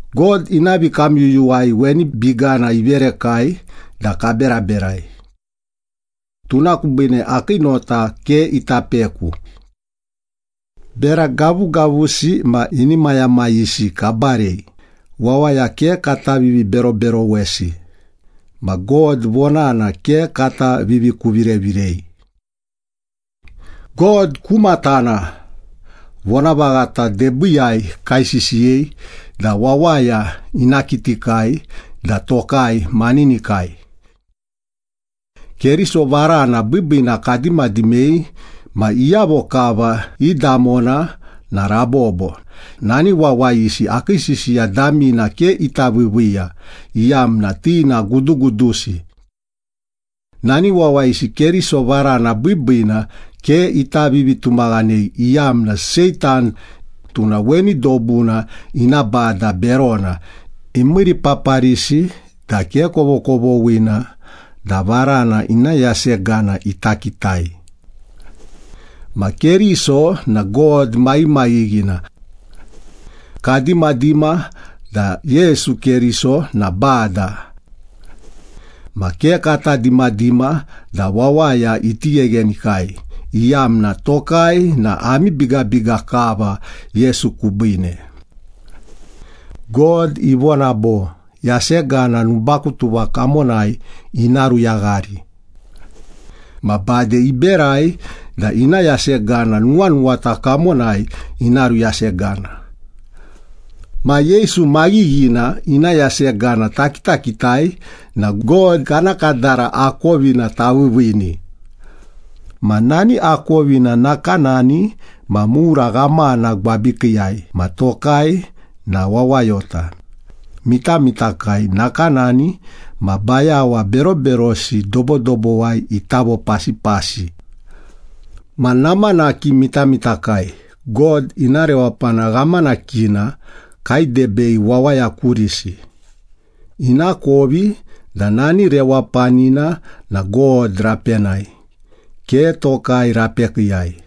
God ina vikamyuyuwai weni bigana iverekai da kaberaberai. Tuna kubine akii nota ke ita peku. Bera gavugavusi ma inimayamayisi kabarei, wawaya ke kata viviberoberowesi, ma God vonana ke kata vivikuvirevirei. God ku matana, vonavaghata debiiyai kaisisiyei da wawaya ina kitikai da tokai maninikai. Keriso varana biibiina kadimadimei ma iyavo kava i damona na rabobo, nani wawayisi akii sisiya damina ke ita viiviiya, iyamna ti na gudugudusi. Nani wawayisi Keriso varana biibiina ke ita vivitumaghanei iyamna Seitan, tuna weni dobuna ina bada berona, imiiripaparisi da ke kovokovoghina da varana ina yasegana ita kitai. Ma Keriso na God maghimaghighina. Kadimadima da Yesu Keriso na Bada. Ma ke kata dimadima da wawaya iti gheghenikai, iyamna tokai na ami bigabiga kava Yesu kubiine. God ivona bo, “Yasegana nubakutuva kamonai ina ruyaghari.” Ma bade iberai da ina yasegana nuwanuwata kamonai ina ruyasegana. Ma Yesu maghighina ina yasegana takitakitai na God kana kadara akovina taviiviini. Ma nani akovina nakanani ma mura ghamana gwabikiiyai ma tokai na wawayota, mitamitakai nakanani ma bayawa beroberosi dobodobowai ita vopasipasi. Ma namanaki mitamitakai, God ina rewapana ghamanakina kaidebei wawaya kurisi, inakovi da nani rewapanina na God rapenai, ke tokai rapekiiyai.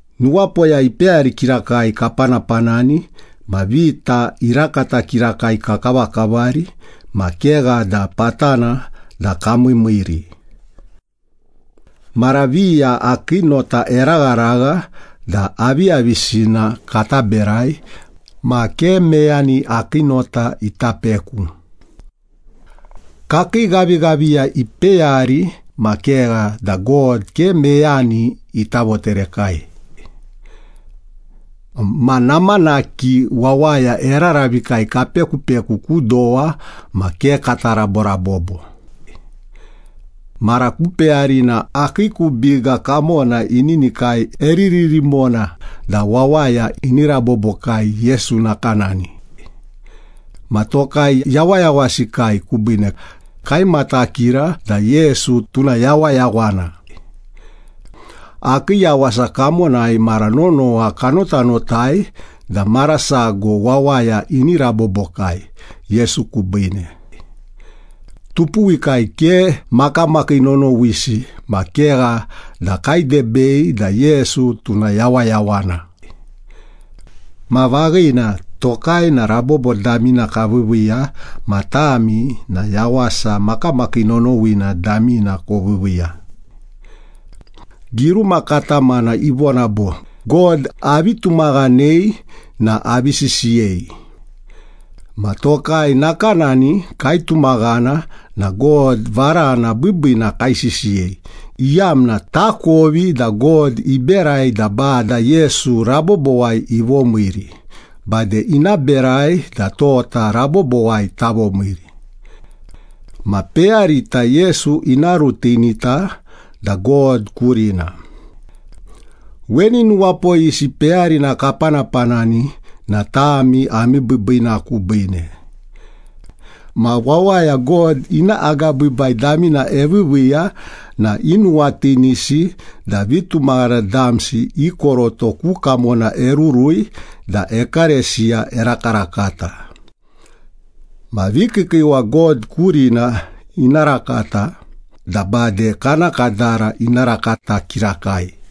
Nuwapoya ipeyari kirakai kapanapanani ma vita irakata kirakai kakavakavari ma kegha da patana da kamiimiiri. Mara viya akii nota eragharagha da aviyavisina kata berai ma ke meyani akii nota ita peku. Kakii ghavighaviya ipeyari ma kegha da God ke meyani ita voterekai. Ma namanaki wawaya eraravikai kapekupeku ku dowa ma ke kata raborabobo. Mara ku peyarina akii ku biga kamona ininikai eriririmona da wawaya ini rabobokai Yesu nakanani. Ma tokai yawayawasikai kubiine, kaimatakira da Yesu tuna yawayawana. Akii yawasa kamonai mara nonowa kanotanotai da mara sago wawaya ini rabobokai Yesu kubiine. Tupuwikai ke makamakii nonowisi ma kegha da kaidebei da Yesu tuna yawayawana. Ma vaghina, tokai na rabobo damina kaviiviiya ma tami, na yawasa makamakii nonowina damina koviiviiya. Giruma katamana ivona bo, “God avi tumaghanei na avi sisiyei.” Ma tokai nakanani kaitumaghana na God varana biibiina kaisisiyei, iyamna takovi da God iberai da Bada Yesu rabobowai ivomiiri, bade ina berai da tota rabobowai tavomiiri. Ma peyarita Yesu ina rutinita da God kurina. Weni nuwapoyisi peyarina kapanapanani na tami ami biibiina kubiine. Ma wawaya God ina agabiibai damina eviiviiya na inuwatinisi da vitumaghana damsi i koroto ku kamona erurui da ekalesiya erakarakata. Ma vikiikiiwa God kurina ina rakata da bade kana kadara ina rakata kirakai.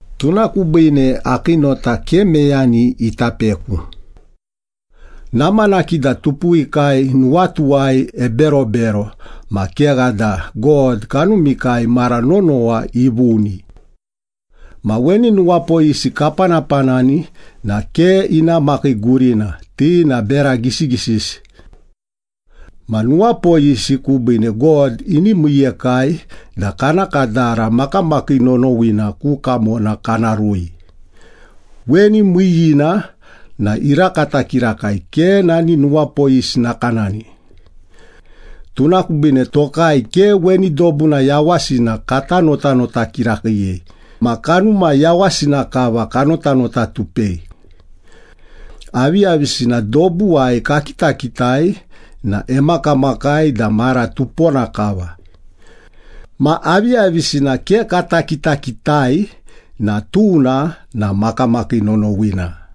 Tuna kubiine akii nota ke meyani ita peku. Namanaki da tupuwikai nuwatuwai eberobero, ma kegha da God kanumikai mara nonowa ivuni. Ma weni nuwapoyisi kapanapanani na ke ina makai gurina, ti na bera gisigisisi. Ma nuwapoyisi kubiine God ini miiyekai da kana kadara makamakii nonowina ku kamona kana rui. Weni miiyiina na irakata kirakai, ke nani nuwapoyisi nakanani. Tuna kubiine tokai ke weni dobuna yawasina kata notanota kirakiiyei ma kanuma yawasina kava kanotanotatupei. Aviyavisina dobuwai kakitakitai na emakamakai da mara tupona kava. Ma aviyavisina ke kata kitakitai na tuna na makamakii nonowina.